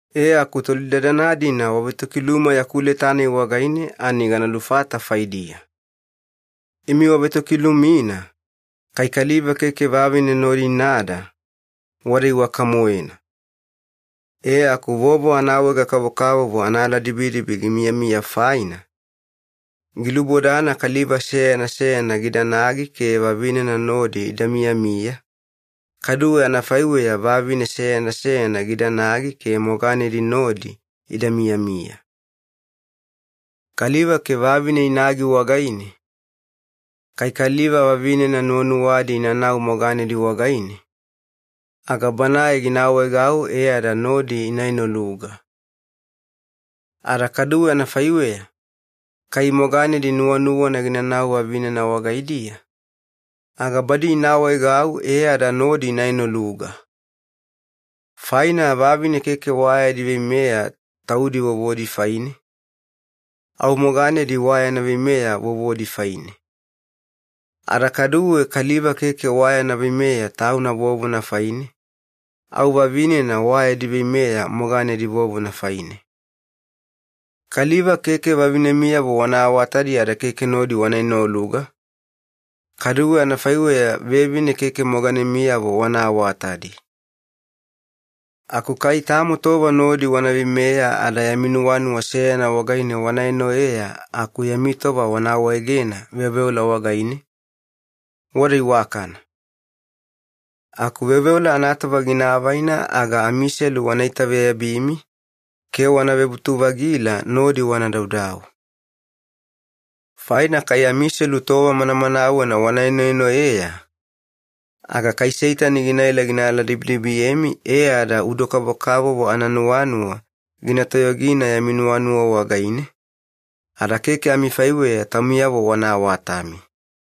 E, aku tolidadana-dina wavetokiluma yaku leta-nai wagaine ani gana lufata faidiya. Imi wavetokilumina, “Kai kaliva keke vavine nodi inada, wada iwaka-moena.” E aku vovo anaawaega-kavokavovo anaaladibidibi gimiyamiya faina, gilubodana kaliva seyana seyana gidanagi ke vavinena nodi ida miyamiya, kaduwe anafaiweya vavine seyana seyana gidanagi ke moganedi nodi ida miyamiya. Kaliva ke vavine inagi wagaine, kai kaliva vavinena nuwanuwadi inanau moganedi wagaine, aga banae gina awaegau e ada nodi ina enoluga. Ada kadu anafaiweya, kai moganedi nuwanuwana ginanau vavinena wagaidiya, aga badi ina awaegau e ada nodi ina enoluga. Faina vavine keke wa yadi veimeya taudi vovodi faine, au moganedi wa yana veimeya vovodi faine. Ada kaduwe kaliva keke wa yana veimeya tauna vovona faine, au vavinena wa yadi veimeya moganedi vovona faine. Kaliva keke vavinemiyavo wana awatadi ada keke nodi wana enoluga, kaduwe anafaiweya vevine keke moganemiyavo wana awatadi. Aku kai tamo tova nodi wana veimeya ada yami nuwanuwa seyana wagaine wana enoeya aku yami tova wana awaegena veoveola wagaine, wada iwakana. Aku veoveola anatova gina avaina aga amiselu wana itaveyabimi ke wana vebutu-vagila nodi wana daudau. Faina kai amiselu tova manamanawena wana enoenoeya, aga kai Seitani ginaela gina aladibidibiyemi e ada udo-kavokavovo ananuwanuwa gina toyogina yami nuwanuwa wagaine, ada keke amifaiweya taumiyavo wana awatami.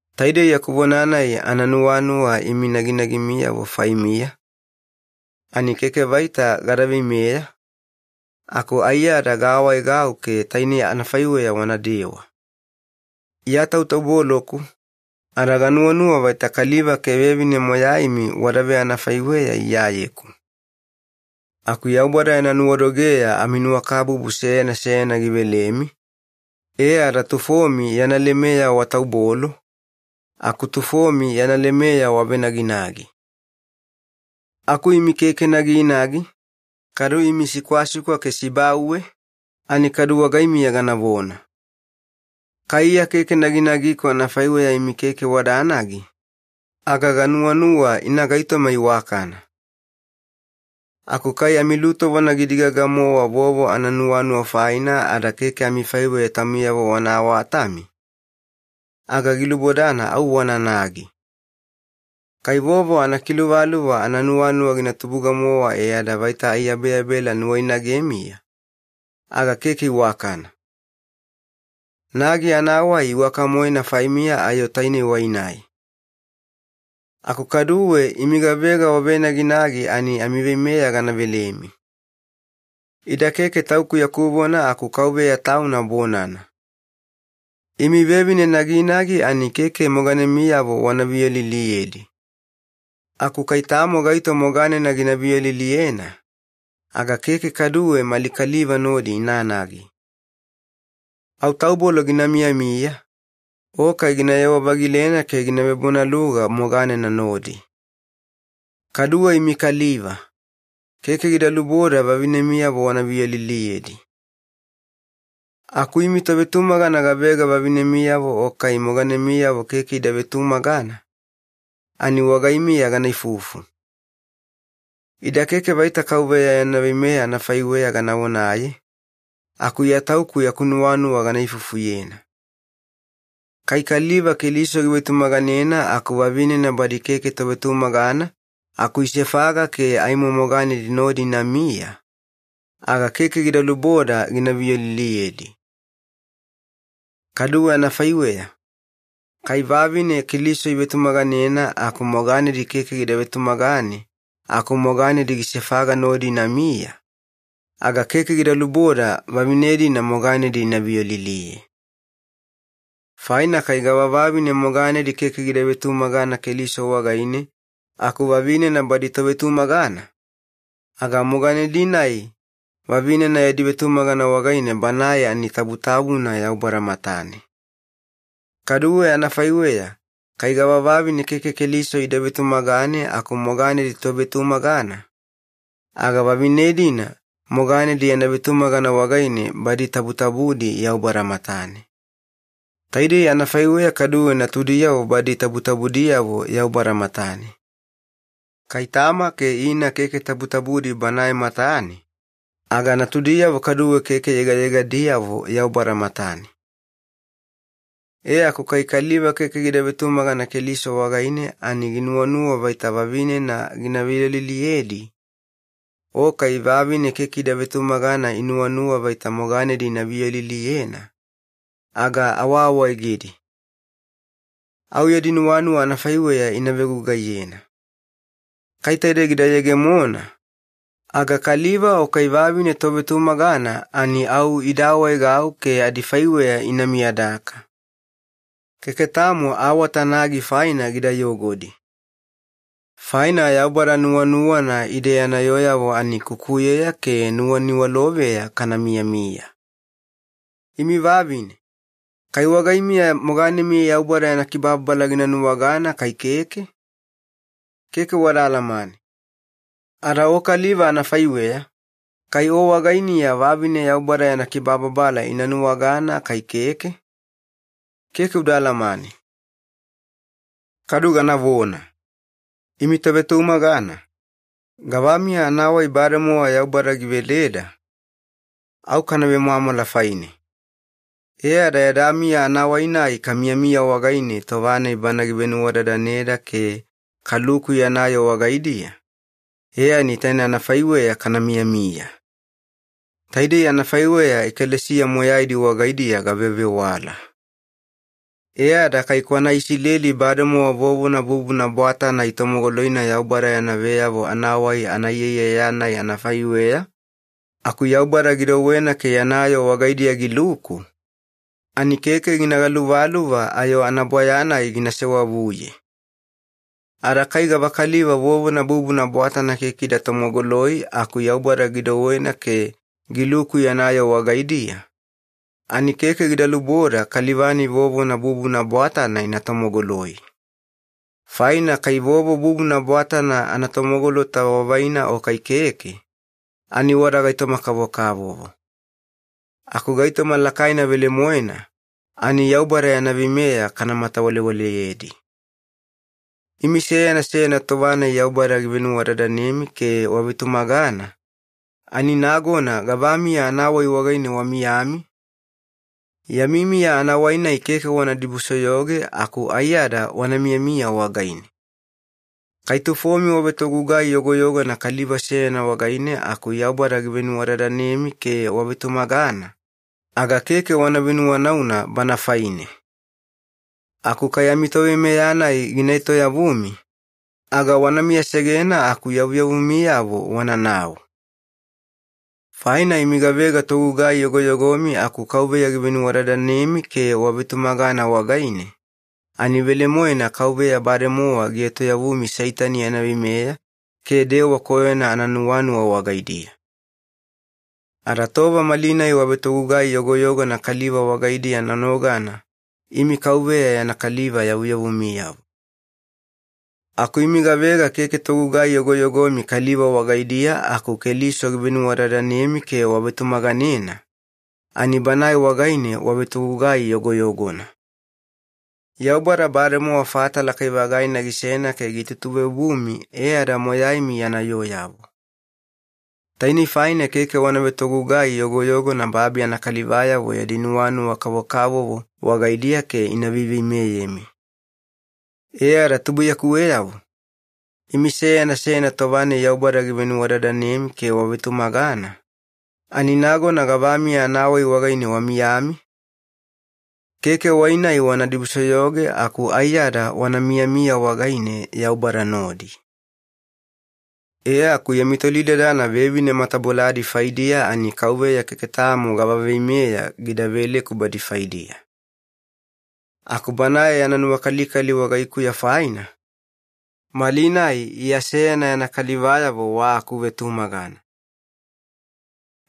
Taidei yaku vona-nai ananuwanuwa imi naginagimiyavo faimiya, ani keke vaita gada veimeya, aku aiyada gaawaegau ke tainei anafaiweya wanadewa. Iya tautauboloku, ada ganuwanuwa vaita kaliva ke vevine moyaimi wada veanafaiweya Iyayeku. Aku Yaubada yana nuwadogeya aminuwakabubu seyana seyana givelemi, e ada tufomi yana lemeya wataubolo, aku tufomi yana lemeya wavenaginagi. Aku imi keke naginagi, kadu imi sikwasikwa ke sibauwe, ani kadu wagaimiya ganavona. Kai Iya keke naginagiku anafaiweya imi keke wadanagi, aga ganuwanuwa ina gaitoma iwakana. Aku kai amilutovona gina digaga-mowa vovo ananuwanuwa faina ada keke amifaiweya taumiyavo wana awatami, aga gilubodana au wananagi. Kai vovo anakiluvaluva ananuwanuwa gina tubuga-mowa e ada vaita aiyabeyabela nuwainagemiya, aga keke iwakana. Nagi anawai iwaka-moena faimiya ayo taine wai-nai. Aku kaduwe imi gavega wavenaginagi ani amiveimeya gana velemi. Ida keke tauku yaku vona aku Kauveya Tauna bonana. Imi vevine naginagi ani keke moganemiyavo wana viyoliliyedi. Aku kai tamo gaito moganena gina viyoliliyena, aga keke kaduwe mali kaliva nodi inanagi. Au taubolo gina miyamiya, o kai ginayewa-vagilena ke gina vebonaluga moganena nodi. Kaduwe imi kaliva, keke gida luboda vavinemiyavo wana viyoliliyedi. Aku imi tovetumagana gavega vavinemiyavo o kai moganemiyavo keke ida vetumagana, ani wagaimiya gana ifufu. Ida keke vaita Kauveya yana veimeya anafaiweya gana vonaye, aku Iya tauku yaku nuwanuwa gana ifufuyena. Kai kaliva Keliso givetumaganena aku vavinena badi keke tovetumagana aku isefaga ke aimo moganedi nodi inamiya, aga keke gida luboda gina viyoliliyedi. Kaduwe anafaiweya, kai vavine Keliso ivetumaganena aku moganedi keke gida vetumagane aku moganedi gisefaga nodi inamiya, aga keke gida luboda vavine-dina moganedi ina viyoliliye. Faina kai gavavavine moganedi keke gida vetumagana Keliso wagaine aku vavinena badi tovetumagana, aga moganedi-nai vavinena yadi vetumagana wagaine banae ani tabutabuna Yaubada matane. Kaduwe anafaiweya kai gavavavine keke Keliso ida vetumagane aku moganedi tovetumagana, aga vavinena-dina moganedi yana vetumagana wagaine badi tabutabudi Yaubada matane. Taidei anafaiweya kaduwe natudiyavo badi tabutabudiyavo Yaubada matane. Kai tama ke ina keke tabutabudi Banae matane, aga natudiyavo kaduwe keke yegayegadiyavo Yaubada matane. E aku kai kaliva keke gida vetumagana Keliso wagaine ani ginuwanuwa vaita vavinena gina viyoliliyedi, o kai vavine keke ida vetumagana ani inuwanuwa vaita moganedi ina viyoliliyena, aga awaawaegedi. Au yadi nuwanuwa anafaiweya ina vegugaiyena. Kai taide gida yegemona, aga kaliva o kai vavine tovetumagana ani au ida awaegau ke adifaiweya ina miyadaka. Keke tamo awata nagi faina gida yogodi. Faina Yaubada nuwanuwana ide yana yooyavo ani kukuyeya ke nuwaniwaloveya kana miyamiya. Imi vavine, kai wagaimiya moganemi Yaubada yana kibababala gina nuwagana kai keke? Keke wada alamane. Ada o kaliva anafaiweya, kai o wagainiya vavine Yaubada yana kibababala ina nuwagana kai keke? Keke uda alamane. Kadu ganavona. Imi tovetumagana, gavamiya anawai bademowa Yaubada giveleda, au kana vemwamwala faine. E ada yada miya anawai-nai kamiyamiya wagaine tova-nai Bana givenuwadadaneda ke kaluku yana yoo wagaidiya, e ani taine anafaiweya kana miyamiya. Taidei anafaiweya ekalesiya moyaidi wagaidiya gavevewala. E ada kai kwana Isileli bademowa vovona bubuna bwatana itomogoloina Yaubada yana veyavo anawai anaiyaiyaya-nai anafaiweya aku Yaubada gidouwena ke yana yoo wagaidiya giluku, ani keke gina galuvaluva ayo anabwaya-nai gina sewavuye. Ada kai gavakaliva vovona bubuna bwatana keke ida tomogoloi aku Yaubada gidouwena ke giluku yana yoo wagaidiya, ani keke gida luboda kaliva-nai vovona bubuna bwatana ina tomogoloi. Faina kai vovo bubuna bwatana anatomogolota wavaina o kai keke, ani wada gaitoma-kavokavovo. Aku gaitoma lakaina velemoena, ani Yaubada yana veimeya kana matawalewaleyedi. Imi seyana seyana tova-nai Yaubada givenuwadadanemi ke wavetumagana, ani nagona gavamiya anawai wagaine wamiyami? Yami miya anawai-nai keke wana dibusoyoge aku aiyada wana miyamiya wagaine. Kai tufomi wavetogugai yogoyogona kaliva seyana wagaine aku Yaubada givenuwadadanemi ke wavetumagana, aga keke wana venuwanauna bana faine. Aku kai amitoveimeya-nai gina etoyavumi, aga wana miyasegena aku yavuyavumiyavo wananau. Faina imi gavega togugai yogoyogomi aku Kauveya givenuwadadanemi ke wavetumagana wagaine, ani velemoena Kauveya bademowa gietoyavumi Seitani yana veimeya ke dewa koyona ananuwanuwa wagaidiya. Ada tova malinai wavetogugai yogoyogona kaliva wagaidiya nonogana imi Kauveya yana kaliva yavuyavumiyavo. Aku imi gavega keke togugai yogoyogomi kaliva wagaidiya aku Keliso givenuwadadanemi ke wavetumaganena, ani Banae wagaine wavetogugai yogoyogona. Yaubada bademowa fata lakai-vagaina gisena ke gitutuveobumi e ada moyaimi yana yooyavo. Tainei faina keke wana vetogugai yogoyogona babi anakalivayavo yadi nuwanuwa kavokavovo wagaidiya ke ina veiveimeyemi. E ada tubuiyakuweyavo, imi seyana seyana tova-nai Yaubada givenuwadadanemi ke wavetumagana, ani nagona gavamiya anawai wagaine wamiyami? Keke wai-nai wana dibusoyoge aku aiyada wana miyamiya wagaine Yaubada nodi. E aku yami tolidadana vevine mataboladi faidiya, ani Kauveya keke tamo gava veimeya gida veleku badi faidiya. Aku Banae yana nuwakalikali wagaikuya faina, malinai Iya seyana yana kalivayavo wa akuvetumagana.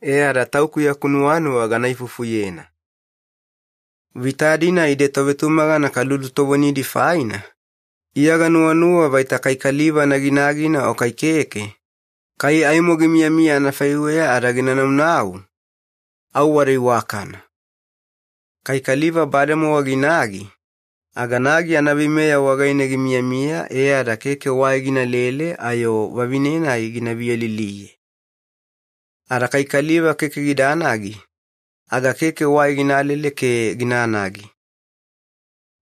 E ada tauku yaku nuwanuwa gana ifufuyena. Vita-dina ide tovetumagana kalulutovonidi faina, Iya ganuwanuwa vaita kai kaliva naginagina o kai keke, kai aimo gimiyamiya anafaiweya ada gina naunau, au wada iwakana. Kai kaliva bademowa ginagi, aga nagi anaveimeya wagaine gimiyamiya e ada keke wai ginalele ayo vavine-nai gina viyoliliye. Ada kai kaliva keke gidanagi, aga keke wai ginalele ke ginanagi.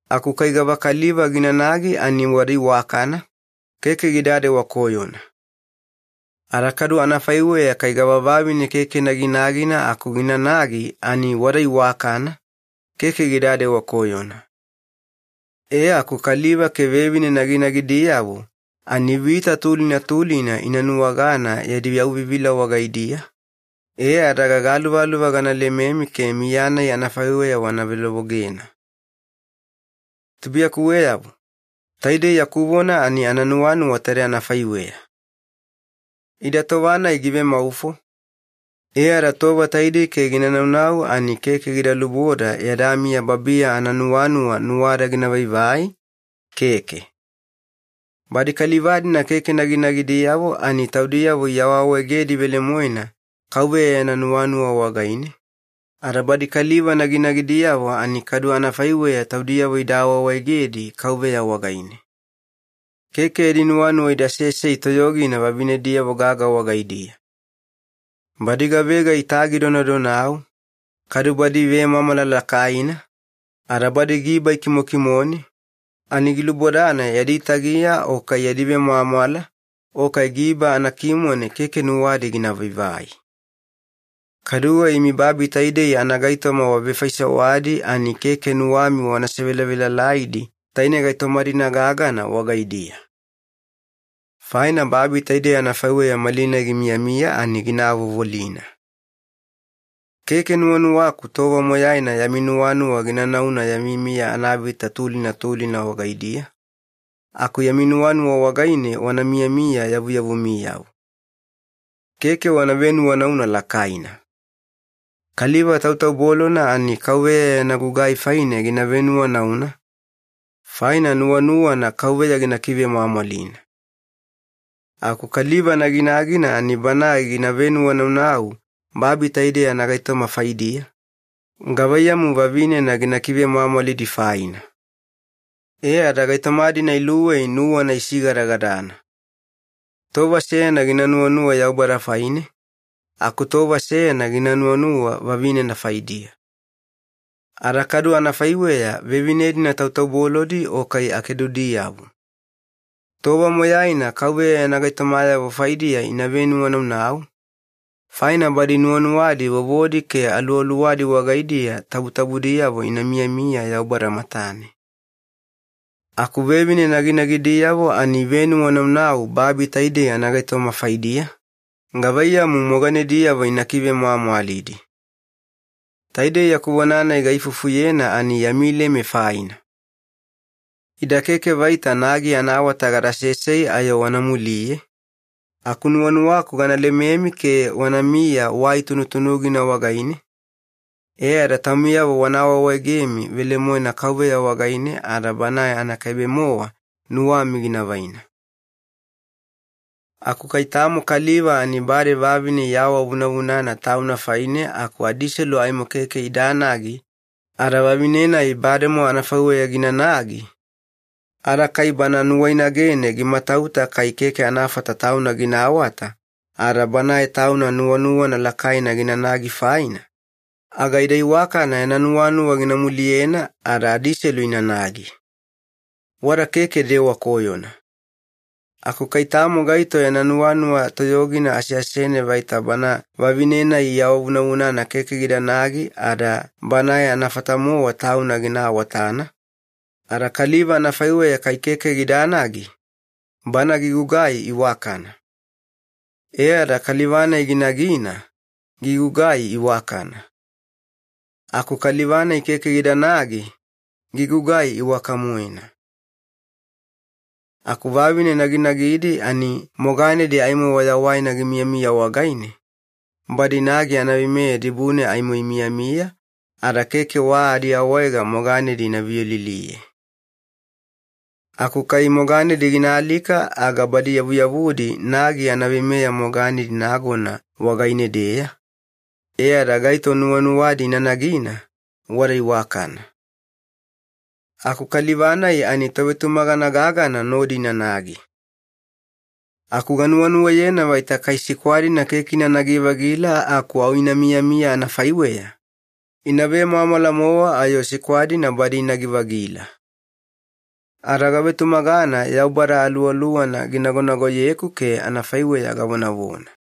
Aku kai gavakaliva ginanagi ani wada iwakana, keke gidadewa koyona. Ada kadu anafaiweya kai gavavavine keke naginagina aku ginanagi ani wada iwakana, keke gidadewa koyona. E aku kaliva ke vevine naginagidiyavo ani vita tulina tulina ina nuwagana yadi yauvivila wagaidiya, e ada gagaluvaluva gana lememi ke miya-nai anafaiweya wana velovogena. Tubuiyakuweyavo, taidei yaku vona ani ananuwanuwa taide anafaiweya. Ida tova-nai givemaufo, e ada tova taidei ke gina naunau ani keke gida luboda yada miya babiya ananuwanuwa nuwada gina vaivai, keke. Badi kaliva-dina keke naginagidiyavo ani taudiyavo iawaawaegedi velemoena Kauveya yana nuwanuwa wagaine, ada badi kaliva naginagidiyavo ani kadu anafaiweya taudiyavo ida awaawaegedi Kauveya wagaine. Keke yadi nuwanuwa ida sesei toyogina vavinediyavo gaga wagaidiya. Badi gavega itagi donadonau, kadu badi ivemwamwala lakaina, ada badi giba ikimokimone, ani gilubodana yadi tagiya o kai yadi vemwamwala o kai giba anakimone keke nuwadi gina vaivai. Kaduwe imi babi taidei anagaitoma wavefaisewadi ani keke nuwami wana sevelavelalaidi taine gaitoma-dina gagana wagaidiya. Faina babi taidei anafaiweya malinai gimiyamiya ani gina avovolina. Keke nuwanuwaku tova moyaina yami nuwanuwa gina nauna yami miya anavita tulina tulina wagaidiya, aku yami nuwanuwa wagaine wana miyamiya yavuyavumiyavo. Keke wana venuwanauna lakaina. Kaliva tautaubolona ani Kauveya yana gugai faine gina venuwanauna, faina nuwanuwana Kauveya gina kivemwamwalina. Aku kaliva naginagina ani banae givenuwanaunau babi taidei anagaitoma faidiya, gavaiyamu vavinena gina kivemwamwalidi faina. E ada gaitoma-dina iluwei nuwana isigadagadana. Tova seyana gina nuwanuwa Yaubada faine, aku tova seyana gina nuwanuwa vavinena faidiya. Ada kadu anafaiweya vevine-dina tautaubolodi o kai akedudiyavo. Tova moyaina Kauveya yana gaitomayavo faidiya ina venuwanaunau, faina badi nuwanuwadi vovodi ke aluwaluwadi wagaidiya tabutabudiyavo ina miyamiya Yaubada matane. Aku vevine naginagidiyavo ani ivenuwanaunau babi taidei anagaitoma faidiya, gavaiyamu moganediyavo ina kivemwamwalidi. Taidei yaku vona-nai gaifufuyena ani yami leme faina. Ida keke vaita nagi anaawata gada sesei ayo wana muliye, aku nuwanuwaku gana lememi ke wanamiya wai tunutunugina wagaine, e ada taumiyavo wana awaawaegemi velemoena Kauveya wagaine ada Banae anakaibe-mowa nuwami gina vaina. Aku kai tamo kaliva ani bade vavine iawavunavunana tauna faine aku adiselu aimo keke idanagi ada vavine-nai bademo anafaiweya ginanagi, ada kai bana nuwainagene gimatauta kai keke anafata tauna gina awata ada banae tauna nuwanuwana lakaina ginanagi faina, aga ida iwakana yana nuwanuwa gina muliyena ada adiselu inanagi. Wada keke dewa koyona. Aku kai tamo gaito yana nuwanuwa toyogina aseasene vaita bana vavine-nai iawavunavunana keke gidanagi ada banae anafata-mowa tauna gina awatana, ada kaliva anafaiweya kai keke gidanagi, bana gigugai iwakana. E ada kaliva-nai ginagina, gigugai iwakana. Aku kaliva-nai keke gidanagi, gigugai iwaka-moena. Aku vavine naginagidi ani moganedi aimo wayawaina gimiyamiya wagaine, badi nagi anaveimeya dibune aimo imiyamiya ada keke wa adiawaega moganedi ina viyoliliye. Aku kai moganedi gina alika aga badi yavuyavudi nagi anaveimeya moganedi nagona wagaine-deya, e ada gaito nuwanuwadi ina nagina, wada iwakana. Aku kaliva-nai ani tovetumagana gagana nodi inanagi. Aku ganuwanuwayena vaita kai sikwa-dina keke inanagi-vagila aku au ina miyamiya anafaiweya, ina vemwamwala-mowa ayo sikwa-dina badi inagi-vagila. Ada gavetumagana Yaubada Aluwaluwana ginagonagoyeku ke anafaiweya gavonavona.